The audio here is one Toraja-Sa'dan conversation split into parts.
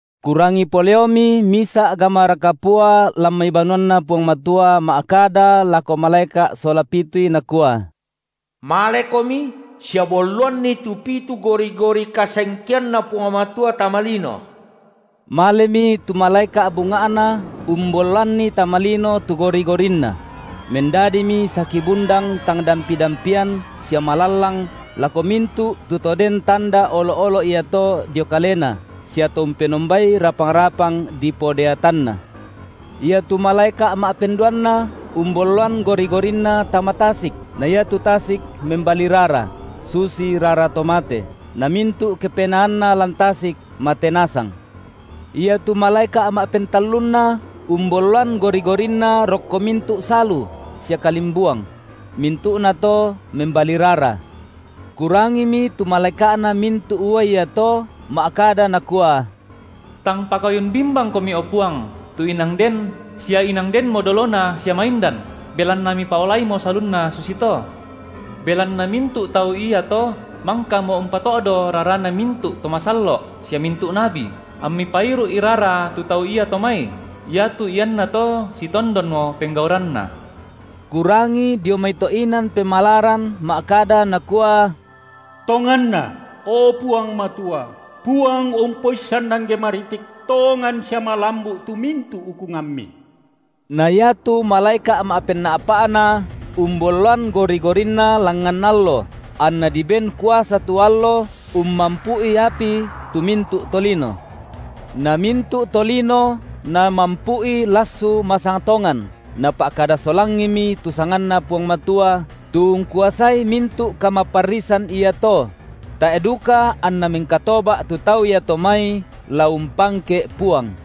Kurangi poleomi misa’ gamara kapua lan mai banuanNa Puang Matua ma’kada lako malaeka’ sola pitui nakua: Malekomi sia bolloanni tu pitu gori-gori kasengkeanNa Puang Matua tama lino. Malemi tu malaeka’ bunga’na umbolloanni tama lino tu gori-gorinna; mendadimi saki bundang tang dampi-dampian sia malallang lako mintu’ tu to den tanda olo’-olo’ iato dio kalena sia to umpenombai rapang-rapang dipodeatanna. Iatu malaeka’ ma’penduanna umbolloan gori-gorinna tama tasik, na iatu tasik membali rara, susi rara to mate, namintu’ kepenaanna lan tasik mate nasang. Iatu malaeka’ ma’pentallunna umbolloan gori-gorinna rokko mintu’ salu sia kalimbuang; mintu’nato membali rara. Kurangimi tu malaeka’na mintu’ uai iato ma’kada nakua: Tang pakayun bimbangKomi, o Puang, tu inang Den, si inang Denmo dolona sia maindan, belanna Mipaolaimo salunna susito. Belanna mintu’ tau iato mangkamo umpato’do rarana mintu’ to masallo’ sia mintu’ nabi, amMi pairu’i rara tu tau iato mai. Iatu iannato sitondonmo penggauranna. Kurangi dio mai to’ inan pemalaran ma’kada nakua: Tonganna, o Puang Matua, Puang Umpoissan angge maritik, tongan sia malambu’ tu mintu’ ukungamMi. Na iatu malaeka’ ma’penna’pa’na umbolloan gori-gorinna langngan allo, anna diben kuasa tu allo ummampu’i api tu mintu’ tolino. Na mintu’ tolino namampu’i lassu masang tongan, napa’kada solangimi tu sanganNa Puang Matua, tu ungkuasai mintu’ kamaparrisan iato; tae’ duka anna mengkatoba’ tu tau iato mai la umpangke’ Puang.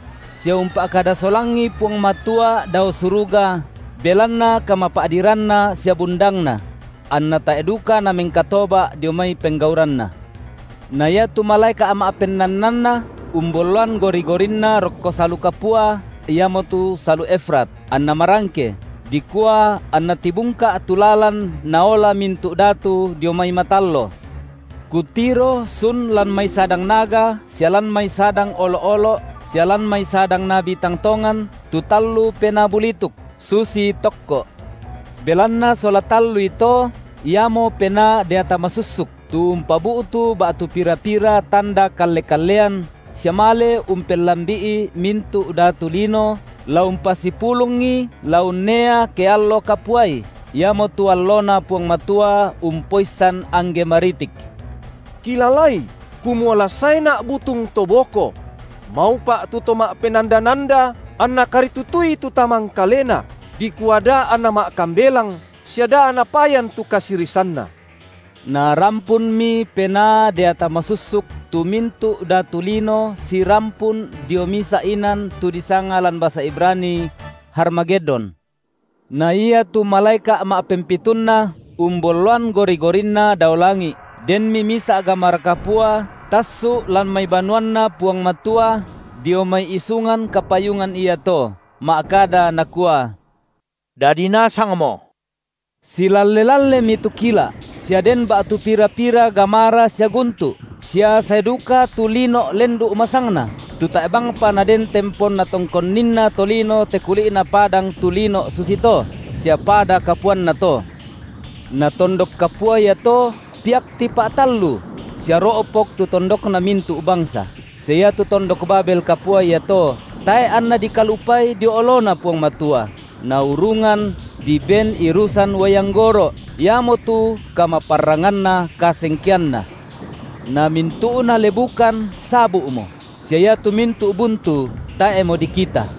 sia umpa’kada solangi Puang Matua dao suruga belanna kamapa’diranna sia bundangna; anna tae’ duka namengkatoba’ dio mai penggauranna. Na iatu malaeka’ ma’pennannanna umbolloan gori-gorinna rokko salu kapua, iamotu salu Efrat, anna marangke, dikua anna tibungka’ tu lalan naola mintu’ datu dio mai matallo. Kutiro sun lan mai sadang naga sia lan mai sadang olo’-olo’ sia lan mai sadang nabi tang tongan tu tallu penaa bulituk, susi tokko’; belanna sola tallui to, iamo penaa deata masussuk, tu umpabu’tu ba’tu pira-pira tanda kalle-kallean sia male umpellambi’i mintu’ datu lino la umpasipulungi la unnea ke allo kapuai, iamotu alloNa Puang Matua Umpoissan angge maritik. Kilalai, kumua la saeNa’ butung to boko; maupa’ tu to ma’penanda-nanda anna karitutui tu tamangkalena, dikua da anna ma’kambelang sia da napayan tu kasirisanna. Narampunmi penaa deata masussuk tu mintu’ datu lino sirampun dio misa’ inan tu disanga lan basa Ibrani: Harmagedon. Na ia tu malaeka’ ma’pempitunna umbolloan gori-gorinna dao langi’, denmi misa’ gamara kapua tassu’ lan mai banuanNa Puang Matua, dio mai isungan kapayungan iato, ma’kada nakua: Dadi nasangmo. Silalle-lallemi tu kila’, sia den ba’tu pira-pira gamara sia guntu’, sia sae duka tu lino’ lendu’ masangna, tu tae’ bangpa naden tempon natongkonninna tolino te kuli’na padang, tu lino’ susito, sia pada kapuanna to. Na tondok kapua iato piak tipa’tallu, sia ro’pok tu tondokna mintu’ bangsa, sia iatu tondok Babel kapua iato tae’ anna dikalupai dio oloNa Puang Matua, naurungan diben irusan uai anggoro’, iamotu kamaparranganna kasengkeanNa. Na mintu’na lebukan sabu’mo, sia iatu mintu’ buntu tae’mo dikita.